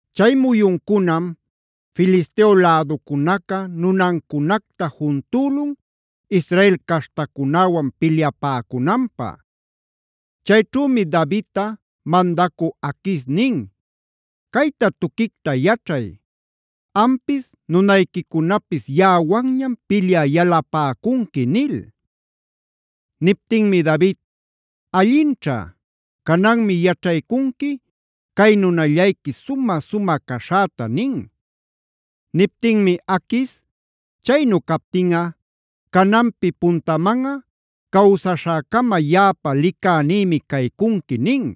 Chay muyuncunam Filisteo läducunaca nunancunacta juntülun Israel caśhtacunäwan pilyapäcunanpä. Chayćhümi Davidta mandacü Aquis nin: “Cayta tuquicta yaćhay: Ampis nunayquicunapis yaꞌawanñam pilyä yalapäcunqui” nil. Niptinmi David: “Allinćha. Cananmi yaćhaycunqui cay nunallayqui sumä-sumä caśhäta” nin. Niptinmi Aquis: “Chaynu captinꞌa cananpi puntamanꞌa cawsaśhäcama yaꞌapa licänïmi caycunqui” nin.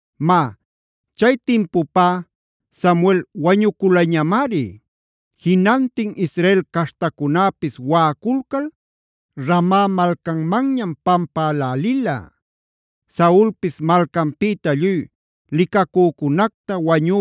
Má, chay timpupá Samuel wañuculañamari. Jinantin Israel caśhtacunäpis waꞌaculcal Rama malcanmanñama pampälälila. Saulpis malcanpïta lluy licacücunacta,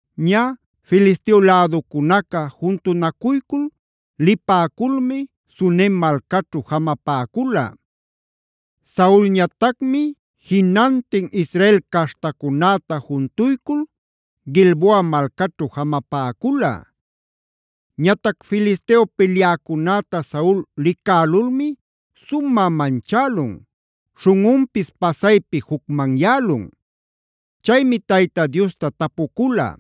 Ñä, Filisteo läducunaca juntunacuycul lipäculmi Sunem malcaćhu jamapäcula. Saulñatacmi jinantin Israel caśhtacunäta juntuycul Gilboa malcaćhu jamapäcula. Ñatac Filisteo pilyäcunäta Saul licälulmi sumä manchälun, śhunꞌunpis pasaypi jucmanyälun. Chaymi Tayta Diosta tapucula.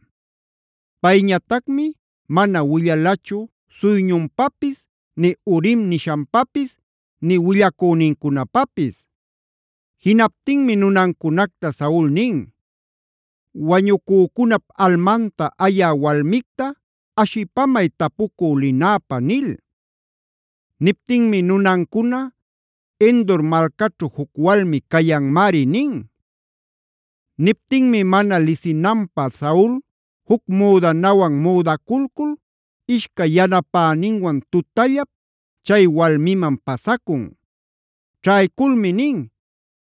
Payñatacmi mana willalachu suyñunpapis nï Urim nishanpapis nï willacünincunapapis. Jinaptinmi nunancunacta Saul nin: “Wañucücunap almanta ayä walmicta ashipamay tapucü linäpä” nil. Niptinmi nunancuna: “Endor malcaćhu juc walmi cayanmari” nin. Niptinmi mana lisinanpä Saul juc müdanawan müdaculcul ishcay yanapäninwan tutallap chay walmiman pasacun. Ćhayculmi nin: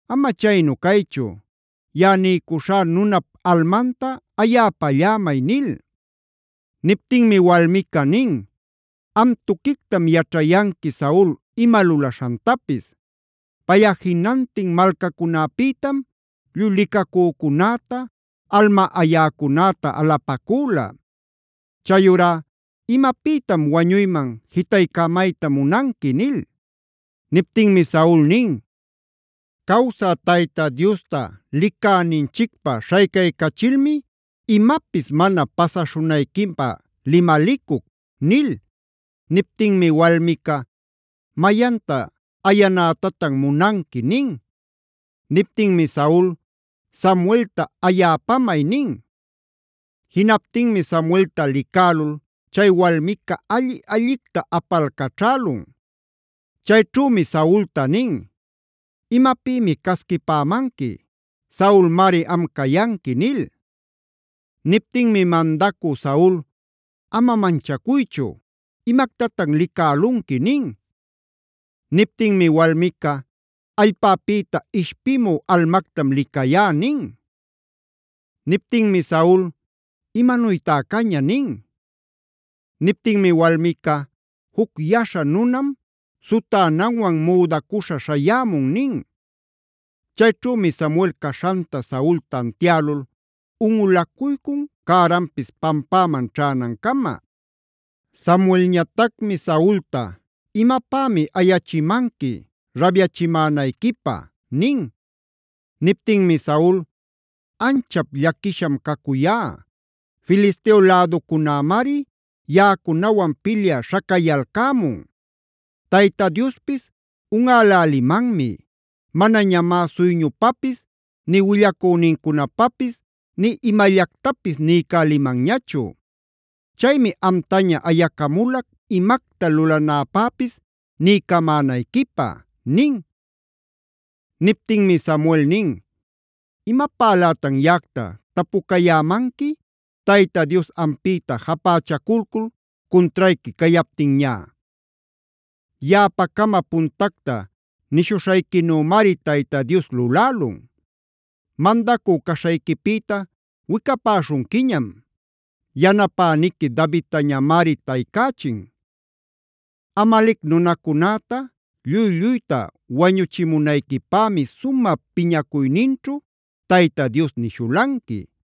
“Ama chaynu caychu, yaꞌa niycuśhá nunap almanta ayäpallämay” nil. Niptinmi walmica nin: “Am tuquictam yaćhanqui Saul ima lulaśhantapis. Payꞌa jinantin malcacunäpïtam lluy licacücunäta, alma ayäcunäta alapacüla. Chayurá ¿imapïtam wañuyman jitaycämayta munanqui?” nil. Niptinmi Saul nin: “Cawsä Tayta Diosta licäninchicpä śhaycaycachilmi imapis mana pasaśhunayquipä limalicuc” nil. Niptinmi walmica: “¿Mayanta ayanätatan munanqui?” nin. Niptinmi Saul: “Samuelta ayäpamay” nin. Jinaptinmi Samuelta licälul, chay walmica alli-allicta apalcaćhälun. Chayćhümi Saulta nin: “¿Imapïmi casquipämanqui? Saulmari am cayanqui” nil. Niptinmi mandacü Saul: “Ama manchacuychu. ¿Imactatan licälunqui?” nin. Niptinmi walmica: “Allpäpïta ishpimü almactam licayá” nin. Niptinmi Saul: “¿Imanuytá caña?” nin. Niptinmi walmica: “Juc yaśha nunam sutänanwan müdacuśha śhayämun” nin. Chayćhümi Samuel caśhanta Saul tantialul unꞌulacuycun cäranpis pampäman ćhänancama. Samuelñatacmi Saulta: “¿Imapämi ayachimanqui rabyachimänayquipä?” nin. Niptinmi Saul: “Anchap llaquisham cacuyá. Filisteo läducunämari yaꞌacunawan pilyä śhacayalcämun. Tayta Diospis unꞌälälimanmi. Manañamá suyñupapis nï willacünincunapapis nï imallactapis niycälimanñachu. Chaymi amtaña ayacamulac imacta lulanäpäpis niycamänayquipä” nin. Niptinmi Samuel nin: “¿Imapälätan yaꞌacta tapucayämanqui Tayta Dios ampïta japächaculcul cuntrayqui cayaptinñá? Yaꞌapacama puntacta nishuśhayquinümari Tayta Dios lulälun. Mandacü caśhayquipïta wicapäśhunquiñam; yanapäniquic Davidtañamari taycächin. Amalec nunacunäta lluy-lluyta wañuchimunayquipämi sumä piñacuyninćhu Tayta Dios nishulanqui.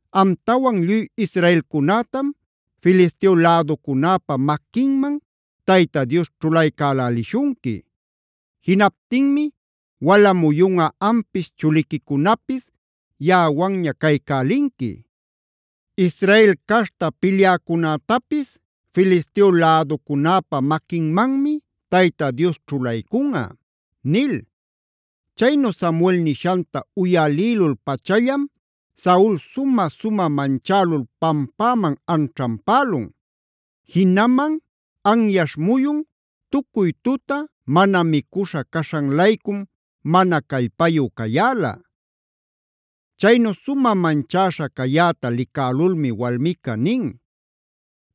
Amtawan lluy Israelcunätam Filisteo läducunäpa maquinman Tayta Dios ćhulaycälälishunqui. Jinaptinmi wala muyunꞌa ampis chuliquicunapis yaꞌawanña caycälinqui. Israel caśhta pilyäcunätapis Filisteo läducunäpa maquinmanmi Tayta Dios ćhulaycunꞌa” nil. Chaynu Samuel nishanta uyalïlul-pachallam Saul sumä-sumä manchälul pampäman anćhanpälun. Jinaman anyaśh muyun, tucuy tuta mana micuśha caśhan-laycum mana callpayu cayäla. Chaynu sumä manchäśha cayäta licälulmi walmica nin: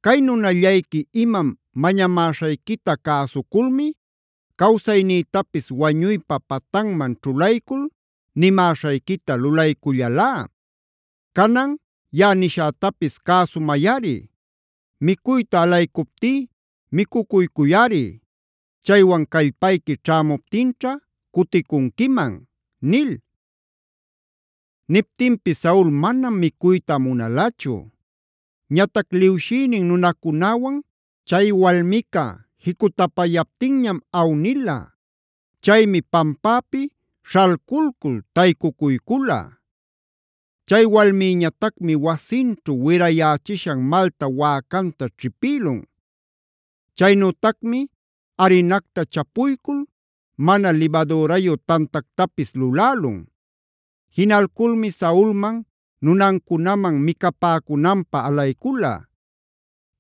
“Cay nunallayqui imam mañamäśhayquita cäsuculmi, cawsaynïtapis wañuypa patanman ćhulaycul nimäśhayquita lulaycullalá. Canan yaꞌa nishätapis cäsumayꞌari: micuyta alaycuptí micucuycuyꞌari; chaywan callpayqui ćhämuptinćha cuticunquiman” nil. Niptinpis Saul manam micuyta munalachu. Ñatac liwshïnin nunacunäwan chay walmica jicutapayaptinñam awnila. Chaymi pampäpi śhalculcul taycucuycula. Chay walmïñatacmi wasinćhu wirayächishan malta wäcanta ćhipïlun. Chaynütacmi arinacta chapuycul mana libadürayu tantactapis lulälun. Jinalculmi Saulman, nunancunaman micapäcunanpä alaycula.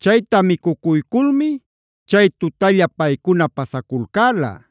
Chayta micucuyculmi chay tutalla paycuna pasaculcäla.